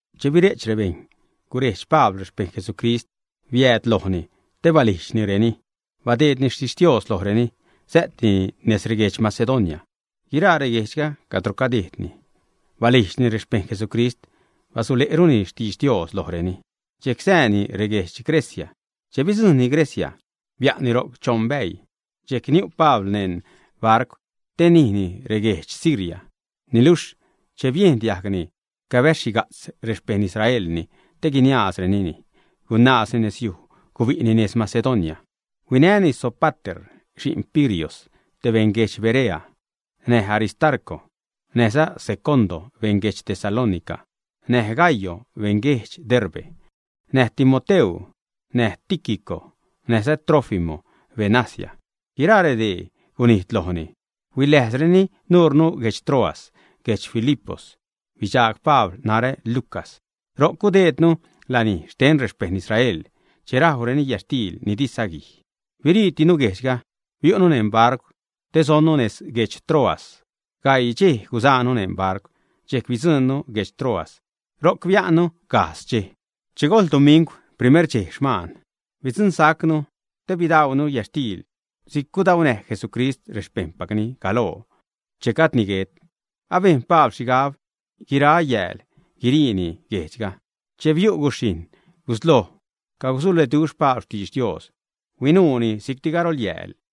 Che bire'ch rebejṉ, gurejdx Pabl rexpejṉ Jesucrist biääd lojni, te balijdxnireni. Badeedni xtixtios lojreni. Sä'tini nez reguedx Macedonia. Guiraa reguejdxga cadro gudejdni, balijdxni rexpejṉ Jesucrist, basule'runi xtidx Dios lojreni. Dxejc sääni reguedx Grecia. Che bidzujṉni Grecia, bia'nni ro'c choṉ bäii. Dxejcti niu' Pabl neṉ barcw te nijni reguejdx Siria. Niluxh che biejn diajgni cabäz-xhiga'tz rexpejṉ Israelni te guiniaazrenini, gunaazni nezyuj, gubi'ni nez Macedonia. Huinäni Sópater, xi'n Pirios, te beṉ guedx Berea; näj Aristarco näjza Secondo, beṉ guedx Tesalónica; näj Gayo, beṉ guedx Derbe; näj Timoteu; näj Tíquico näjza Trófimo, beṉ Asia. Guiraa redee gunijd loonu, huiläjzreni nuure guedx Troas. Guedx Filipos bidxaag Pabl narä, Lucas. Ro'c gudejdnu lanij xten rexpejṉ Israel che rajwreni yätxtiil ni di saguij. Biriitinu guejdxga, biu'nu neṉ barcw te sonnu nez guedx Troas. Gaii dxej gusaanu neṉ barcw, dxejc bidzuṉnu guedx Troas. Ro'c bia'nnu gajdz dxej. Che gojl dumingw, primer dxej xman, bidxagsa'nu te bidaunu yätxtiil si'c gudaunäj Jesucrist rexpejṉpacni galoo che gajdni guet. Abejn Pabl xhigab guira yääl guiriini guejdxga. Che biu' guxhijṉ, gusloj cagusuleduxh Pabl xtidx Dios, huinuuni si'cti garolyäälli.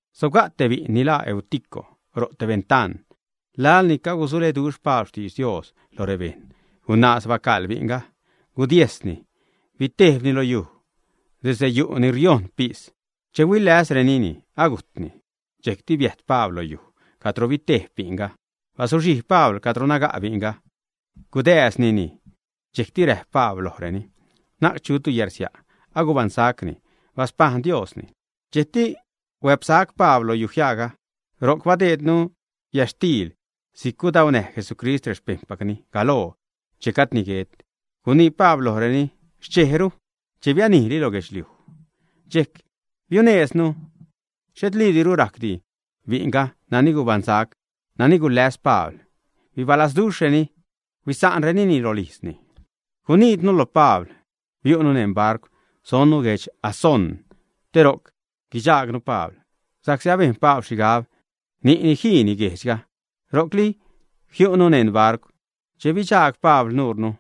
Sobga' te bi'n ni laa Eutico ro' te bentaan. Laḻ ni cagusuleduxh Pabl xtidx Dios lo rebejṉ, gunaaz bacaḻ bi'nga, gudiejsni, bitejbni lo yuj desde yu' ni riojṉ pis. Che huiläsrenini, agujtni. Dxejcti biäjt Pabl lo yuj cadro bitejb bi'nga. Bazuxhijb Pabl cadro naga' bi'nga, gudääznini. Dxejcti räjp Pabl lojreni: ―Na'c chutu yärsia'. Agubaṉsacni. Baspajṉ Diosni. Dxejcti huäpsac Pabl lo yujiaaga. Ro'c bidaunu yätxtiil si'c gudaunäj Jesucrist rexpejṉpacni galoo che gajdni guet. Gunii Pabl lojreni xchejru, che bianijli lo guedxliuj. Dxejc biunejzni. Xhetliidiru rajcdi bi'nga nani gubaṉsac, nani guläs Pabl. Bibalazduxhreni, huisa'nrenini rolijzni. Gunijdnu lo Pabl. Biu'nu neṉ barcw, sonnu guedx Asón, te ro'c guidxaagnu Pabl, sa'csi abejn Pabl xhigab ni'ni jiini guejdxga, ro'cli jiu'ni neṉ barcw. Che bidxaag Pabl nuunu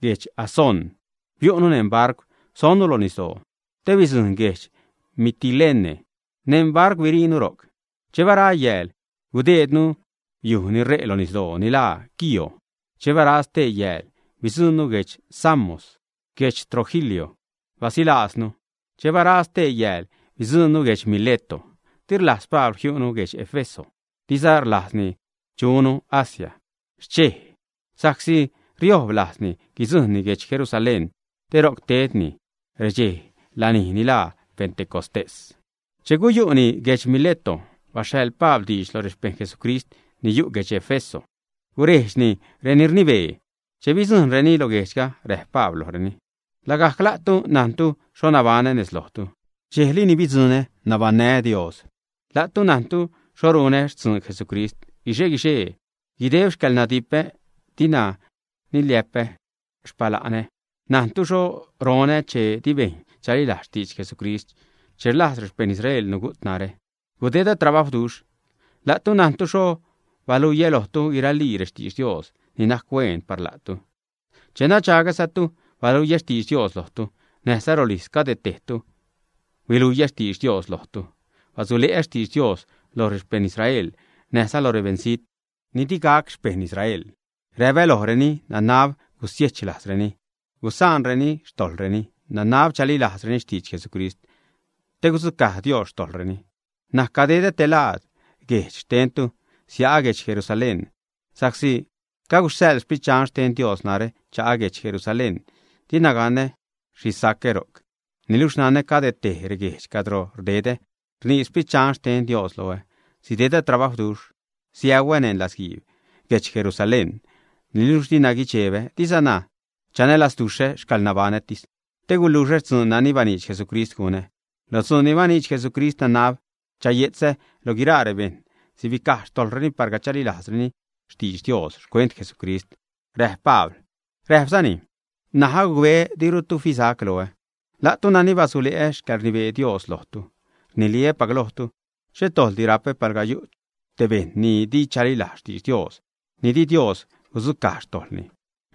guedx Asón, biu'ni neṉ barcw, sonnu lo nisdoo te bidzuṉnu guedx Mitilene. Neṉ barcw biriinu ro'c. Che bara yääl, gudejdnu yuj ni ṟe' lo nisdoo ni laa Quío. Che bara stee yääl, bidzuṉnu guedx Samos. Guedx Trogilio basilaaznu. Che bara stee yääl, bidzuṉnu guedx Mileto. Di rlajz Pabl jiu'nu guedx Éfeso, diza rlajzni chunu Asía xchej, sa'csi riojb lajzni guidzuṉnu guedx Jerusalén te ro'c tedni redxe lanij ni laa Pentecostés. Che guyu'nu guedx Mileto, baxhaḻ Pabl diidx lo rexpejṉ Jesucrist ni yu' guedx Éfeso, gurejdxni reni rnibee. Che bidzujṉreni lo guejdxga, räjp Pabl lojreni: ―Lagajc la'tu najntu xho nabaṉä nez lojtu, dxejli ni bidzuṉä, nabaṉnää́ Dios. La'tu najntu xho runä xtzuun Jesucrist guixe-guixee, guideb xcäḻnadipä. Dina niliä'p ä xpala'nä. Najntu xho ronä che di bejṉ chalilajz xtidx Jesucrist. Che rlajz rexpejṉ Israel nugu't narä, gudedä trabajwduxh. La'tu najntu xho baluiä lojtu guiralii rextidx Dios ni najc huen par la'tu. Che nadxagsa'tu baluiä xtidx Dios lojtu, näjza rolijz cade tejtu huiluiä xtidx Dios lojtu. Basule'ä xtidx Dios lo rexpejṉ Israel näjza lo rebeṉzijt ni di gac xpejṉ Israel. Räpä lojreni nanab gusiechlajzreni, gusa'nreni xtojḻreni, nanab chalilajzreni xtidx Jesucrist te gudzucaj Dios xtojḻreni. N̲aj cadedä te laad guejdx xtentu, sia'ä guedx Jerusalén, sa'csi caguxhaḻ Sprit Dxan xten Dios narä cha'ä guedx Jerusalén. Dina ganä xhi sacä ro'c. Niluxh nanä cade tej reguejdx cadro rdedä rnii Sprit Dxan xten Dios loä sidedä trabajwduxh, siäuä́ neṉ latzguiib guedx Jerusalén. Niluxh dina guidxebä, dizana chanälazduxhä xcäḻnabaṉätis, te guluxä dzuun nani baniidx Jesucrist gunä. Lo dzuun ni baniidx Jesucrist nanab chaye'tzä lo guiraa rebejṉ sibicaj xtojḻreni palga chalilajzreni xtidx Dios xcuent Jesucrist ―räjp Pabl. Räjpzani: ―N̲aj agucbeä dirutu fisac loä, la'tu nani basule'ä xcäḻrnibee Dios lojtu. Rniliä́pac lojtu, xhet dojḻdi rapä palga yu' te bejṉ ni di chalilajz xtidx Dios, ni di Dios gudzucaj xtojḻni.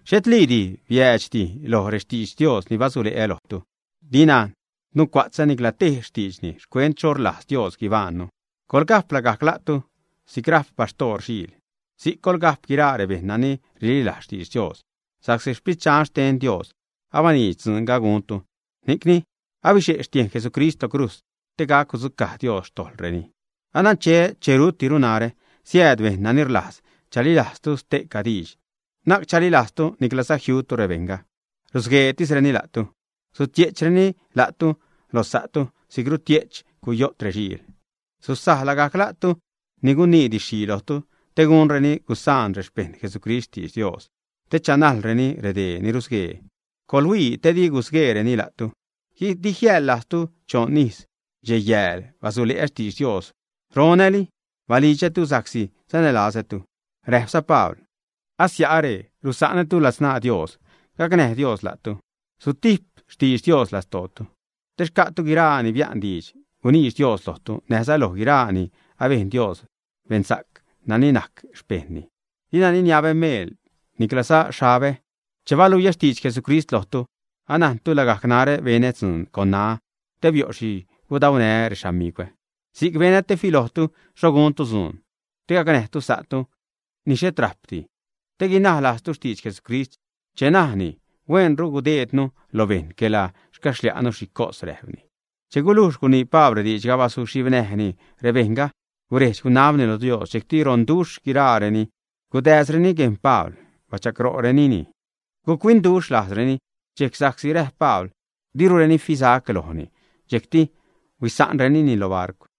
Xhetliidi biäädxdi loj rextidx Dios ni basule'ä lojtu. Dina nucua'tzä nicla tej xtiidxni xcuent xho rlajz Dios guibaṉnu. Coḻga'p lagajc la'tu si'c ra'p baxhtoor xiil, si'c coḻga'p guiraa rebejṉ nani rililajz xtidx Dios sa'csi Sprit Dxan xten Dios abaniidx dzuunga guntu, ni'cni abixe' xtiejn Jesucrist lo crujz te gac gudzucaj Dios xtojḻreni. Anancheä che rutdiru narä, siääd bejṉ nani rlajz chalilajztu ste'ca diidx, na'c chalilajztu niclaza jiutu rebejṉga. Rusgueetisreni la'tu. Sutie'chreni la'tu lo sa'tu si'c rutie'ch cuyo't rexiil. Su'za lagajc sa'tu ni guinii didx-xhii lojtu te gunreni gusaan rexpejṉ Jesucrist xtidx Dios, te chanajlreni redee ni rusguee. Coḻhuii te di gusgueereni la'tu. Di jiäḻ-lajztu choṉ ijz, dxej yääl basule'ä xtidx Dios, ronäli balidxätu, sa'csi sanälazätu. Räjpza Pabl: ―Asia'are, rusa'nätu ladzṉaa Dios, gacnäj Dios la'tu. Sutijp xtidx Dios lastootu, te xca'tu guiraa ni bia'n diidx guniidx Dios lojtu, näjza loj guiraa ni abejn Dios beṉsa'c, nani najc xpejṉni. Dina niniabä meel, niclaza xhabä che baluiä xtidx Jesucrist lojtu. Anajntu lagajc narä benä dzuun con ṉaä te bio' xhi gudaunää rexamigwä. Si'c benä te filojtu xho guntu dzuun te gacnäjtu sa'tu ni xhet rajpdi, te guinaj lajztu xtidx Jesucrist che najni: “Huenru guideednu lo bejṉ quela xcaxlia'nu xhi cos” ―räjpni. Che gulujx gunii Pabl rediidxga, bazuxhibnäjni rebejṉga, guredx-gunabni lo Dios. Dxejcti ronduxh guiraareni gudääzreni guejn Pabl, bachagro'renini. Guc-huinduxh lajzreni dxejc sa'csi räjp Pabl dirureni fisac lojni. Dxejcti huisa'nrenini lo barcw.